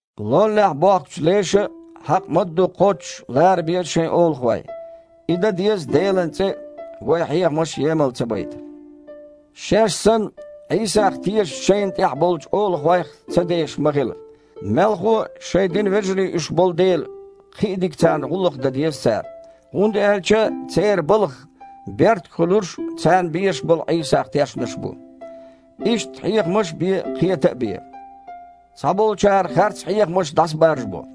Лоллехь бохкучу леша а, хьакъ мадду кхоччуш лара беза шайн олахой. И дан деза Делан цІе а, вайн хьехамаш а емал ца байта. Шаьш санна Іийсах тешачу шайна тІехь болчу олахойх ца дешаш ма хила. Мелхо а, шайн динан вежарий уьш болу дела, кхин а дика царна гІуллакх дан деза цара. ХІунда аьлча церан балхах беркат хуьлурш царна безаш болу Іийсах тешнарш бу. Иштта хьехамаш а бе, кхета а бе. Цхьаболчара харц хьехамаш дІасабаржабо.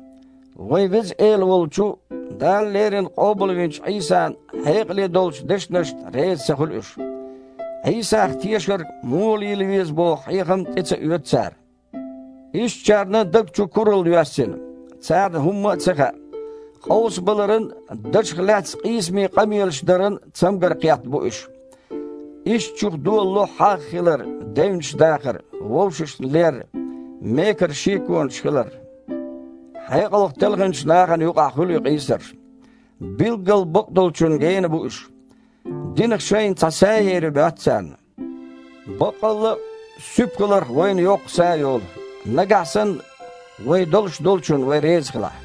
Вайн Веза Эла волчу, Дала леррина къобалвинчу Іийсан хьекъале долчу дешнашна реза ца хуьлу уьш. Іийсах тешарг муха лела веза боху хьехам а тІе ца оьцу цара. Ишттачарна даг чу куралла йоьссина. Царна хІумма а ца хаьа. Къовсабаларан а, дашах лаьцна къийсаме къамелаш даран а цамгар кхетта бу уьш. Ишттачух долало хьагІ хилар, девнаш дахар, вовшашна лер, мекара шеконаш хилар. Хьекъалх телхинчу нахана юкъахь хуьлу и къийсарш. Билггал бакъдолчунна гена бу уьш. Динах шайна цхьа са ер ю моьтту царна. Баккъалла а, суьпа хиларх вайна йоккха са йолу, нагахь санна вайн долуш долчунна вай реза хилахь.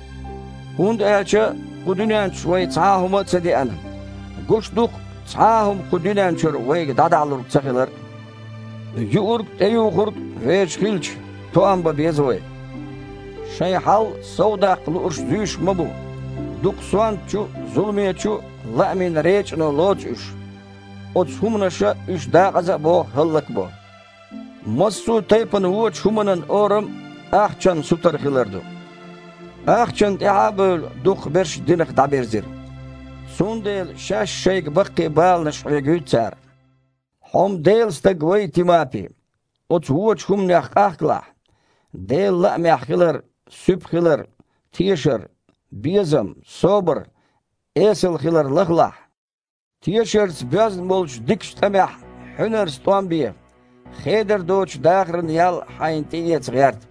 ХІунда аьлча кху дуьнен чу вай цхьа а хІума ца деана, гуш ду-кх цхьа а хІума кху дуьнен чуьра вайга дІадахьалург ца хилар а. Юург а, тІеюхург а вешан хилча, тоам бан беза вай. Шайн хьал совдаккха луурш зуьйш ма бу. Дукха сонтачу а, зуламечу а лаамийн речІано лоцу уьш. Оцу хІуманаша уьш дакъаза а боху, хІаллак а бо. Массо а тайпана вочу хІуманан орам – ахчанна сутара хилар ду. Ахчанна тІаьхьа а бевлла, дукхахберш динах дІабирзира. Цундела шаьш-шайга баккхий баланаш хьоьгуьйту цара. Хьо-м Делан стаг вай, Тимапи. Оцу вочу хІуманех къахкалахь. Делан лаамехь хилар, суьпа хилар, тешар, безам, собар, эсала хилар лахалахь. Тешарца боьзна болчу дикачу тІамехь хьуьнарца тІом бе, хедар доцучу дахаран ял хьайна тІеэца гІерта.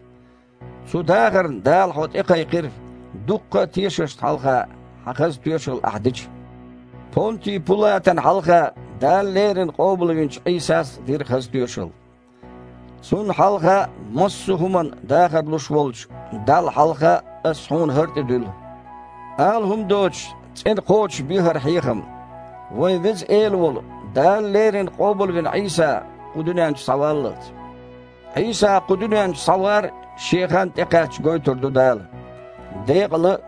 Цу дахарна Дала хьо тІекхайкхира, дуккха а тешашна хьалха хьайн хаза тоьшалла ахь дича. Понти Пулатана хьалха Дала леррина къобалвинчу Іийсас а дира хаза тоьшалла. Цунна хьалха а, массо а хІуманна дахар луш волчу Далла хьалха а ас хьуна хІара тІедуьллу: ала хІума доцуш цІена кхочушбе хІара хьехам, вайн Веза Эла волу, Дала леррина къобалвина Іийса кху дуьнен чу схьаваллалц. Іийса кху дуьнен чу схьавар шен хан тІекхаьчча гойтур ду Дала – декъала а,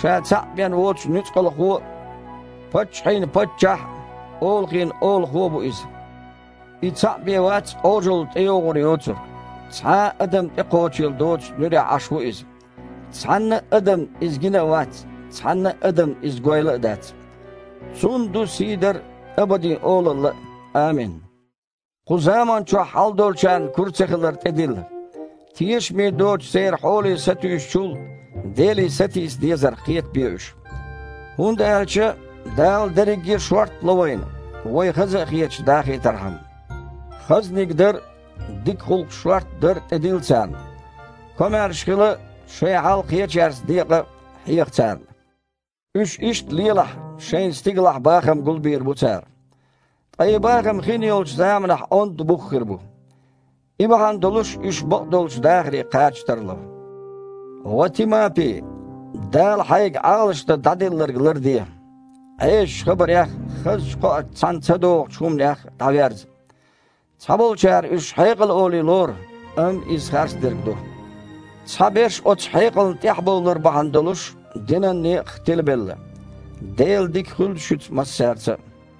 Ша цхьаъ бен воцу Нуьцкъалхо а, паччахьийн Паччахь а, олахойн а Олахо а ву Иза. И цхьаъ бен вац Іожалла тІейогІур йоцург. Цхьа а адам тІекхочийла доцучу нуьрехь Іаш ву Иза. Цхьанна а адамна Иза гина а вац, цхьанна а адамна Иза гойла а дац. Цунна ду сийдар а, абаден олалла а. Амин. Кху заманчохь хьалдолчарна кура ца хилар тІедилла. Тешаме доцучу церан хьоле сатуьйсучул, Деле сатийса дезарх кхетабе уьш. ХІунда аьлча Дала дерриге а шортта ло вайна, вай, хаза а хеташ, дахийтархьама. Хазаниг дар а, дика гІуллакхаш шортта дар а тІедилла царна. Комаьрша хила а, шайн хьал кхечаьрца декъа а хьеха царна. Уьш иштта лелахь, шайна стигалахь бахам гулбийр бу цара. Ткъа и бахам хинйолчу заманахь онда бух хир бу. И бахьана долуш уьш бакъдолчу дахаре кхача тарло. Ва Тимапи! Дала хьайга Іалашдан дІаделларг ларде. Іесачу хабарех а, хазачу кхоаца цхьаьна ца догІучу хІуманех а дІаверза. Цхьаболчара уьш «хьекъал» олий лору, амма иза харцдерг ду. Цхьаберш, оцу хьекъална тІаьхьабовлар бахьана долуш, динан некъах тилабелла. Делан дика хуьлда шуьца массаьрца а.